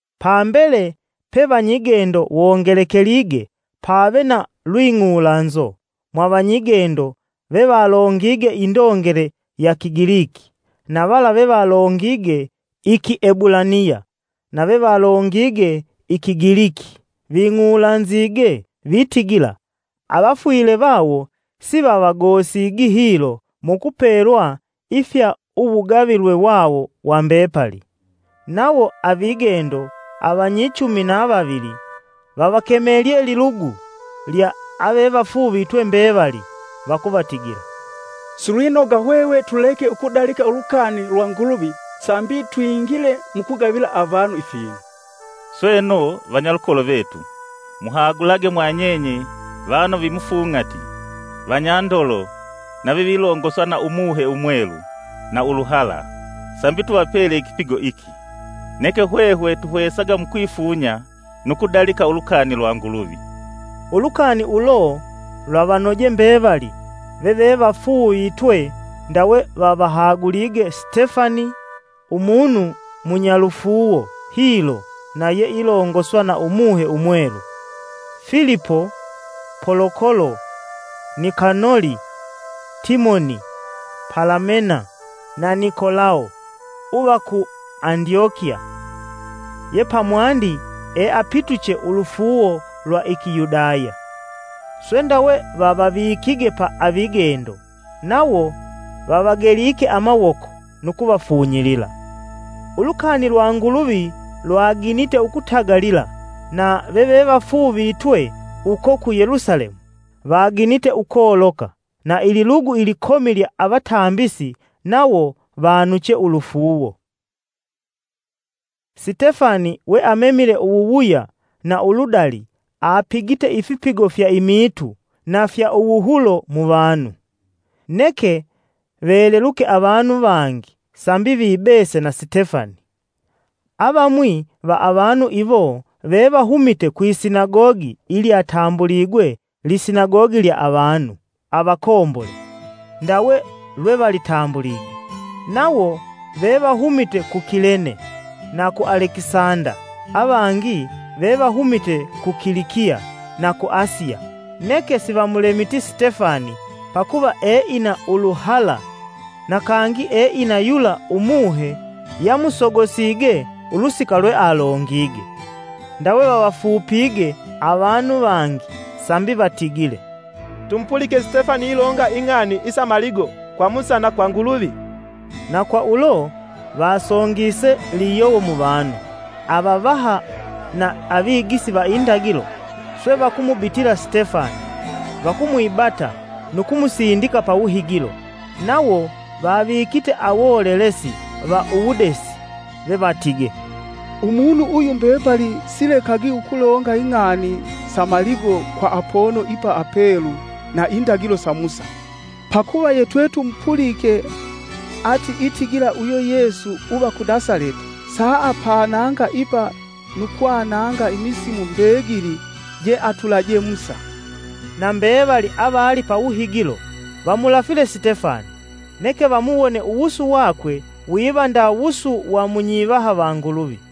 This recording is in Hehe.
Pambele pe vanyigendo wongelekelige, pave na lwing'ulanzo mwa vanyigendo vevalongige indongele ya Kigiliki na vala vevalongige iki Hebulaniya, na vevalongige i Kigiliki ving'ulanzige vitigila, avafwile vawo sivavagosigi hilo mu kupelwa ifya muwugulumu wawo wa mbepali. Nawo avigendo avanyichumi na vavili vavakemelye lilugu lya avevafuuvitwe mbevali, vakuvatigila, “Silwinoga hwehwe tuleke ukudalika ulukani lwa Nguluvi sambi twingile mukugavila avanu ifinu. Sweno, vanyalukolo vetu, muhagulage mwanyenye vanu vimufung'ati, vanyandolo na vevilongoswa na Umuhe Umwelu na uluhala, sambi tuvapele ikipigo iki. Neke hwehwe, tuhwesaga mukwifunya nu kudalika ulukani lwa Nguluvi.” Ulukani ulo lwavanoje mbevali vevevafuuvitwe. Ndawe vavahagulige Stefani, umunu munyalufuuwo hilo na yeilongoswa na Umuhe Umwelu, Filipo, Polokolo, Nikanoli, Timoni, Palamena, na Nikolao uva ku Andyokiya yepamwandi eapituche ulufuuwo lwa iki Yudaya. Swe ndawe vavavikige pa avigendo, nawo vavagelike amawoko nu kuvafunyilila. Ulukani lwa Nguluvi lwaginite ukutagalila na vevevafuuvitwe uko ku Yelusalemu, vaginite ukoloka, na ililugu likomi lya avatambisi nawo vanuche ulufuuwo. Sitefani we amemile uwuwuya na uludali apigite ifipigo fya imiitu na fya uwuhulo mu vanu. Neke veleluke avanu vangi sambi vibese na Sitefani. Avamwi va avanu iwo vevahumite kwisinagogi ilyatambuligwe, “Lisinagogi lya Avanu Avakombole.” (ndawe lwevalitambulige) nawo vevahumite ku Kilene na ku Alekisanda; avangi vevahumite ku Kilikiya na ku Asiya. Neke sivamulemiti Sitefani pakuva eina uluhala na kangi eina yula Umuhe yamusogosige ulusika lwealongige. Ndawe vavafupige avanu vangi sambi vatigile, “Tumupulike Sitefani ilonga ing'ani isa maligo kwa Musa na kwa Nguluvi!” Na kwa ulo, vasongise liyowo muvanu, avavaha na avigisi va indagilo. Swe vakumubitila Sitefani, vakumwibata nu kumusindika pawuhigilo. Nawo vavikite awolelesi va uwudesi vevatige, “Umunu uyu mbepali silekagi ukulonga ing'ani sa maligo kwa apono ipa apelu na indagilo sa Musa. Pakuva yetwetumupulike ati itigila uyo Yesu uva ku Nasaleti saapananga ipa nu kwananga imisimu mbegili jeatulaje Musa.” Na mbevali avali pawuhigilo vamulafile Sitefani neke vamuwone uwusu wakwe wiva nda wusu wa munyivaha va Nguluvi.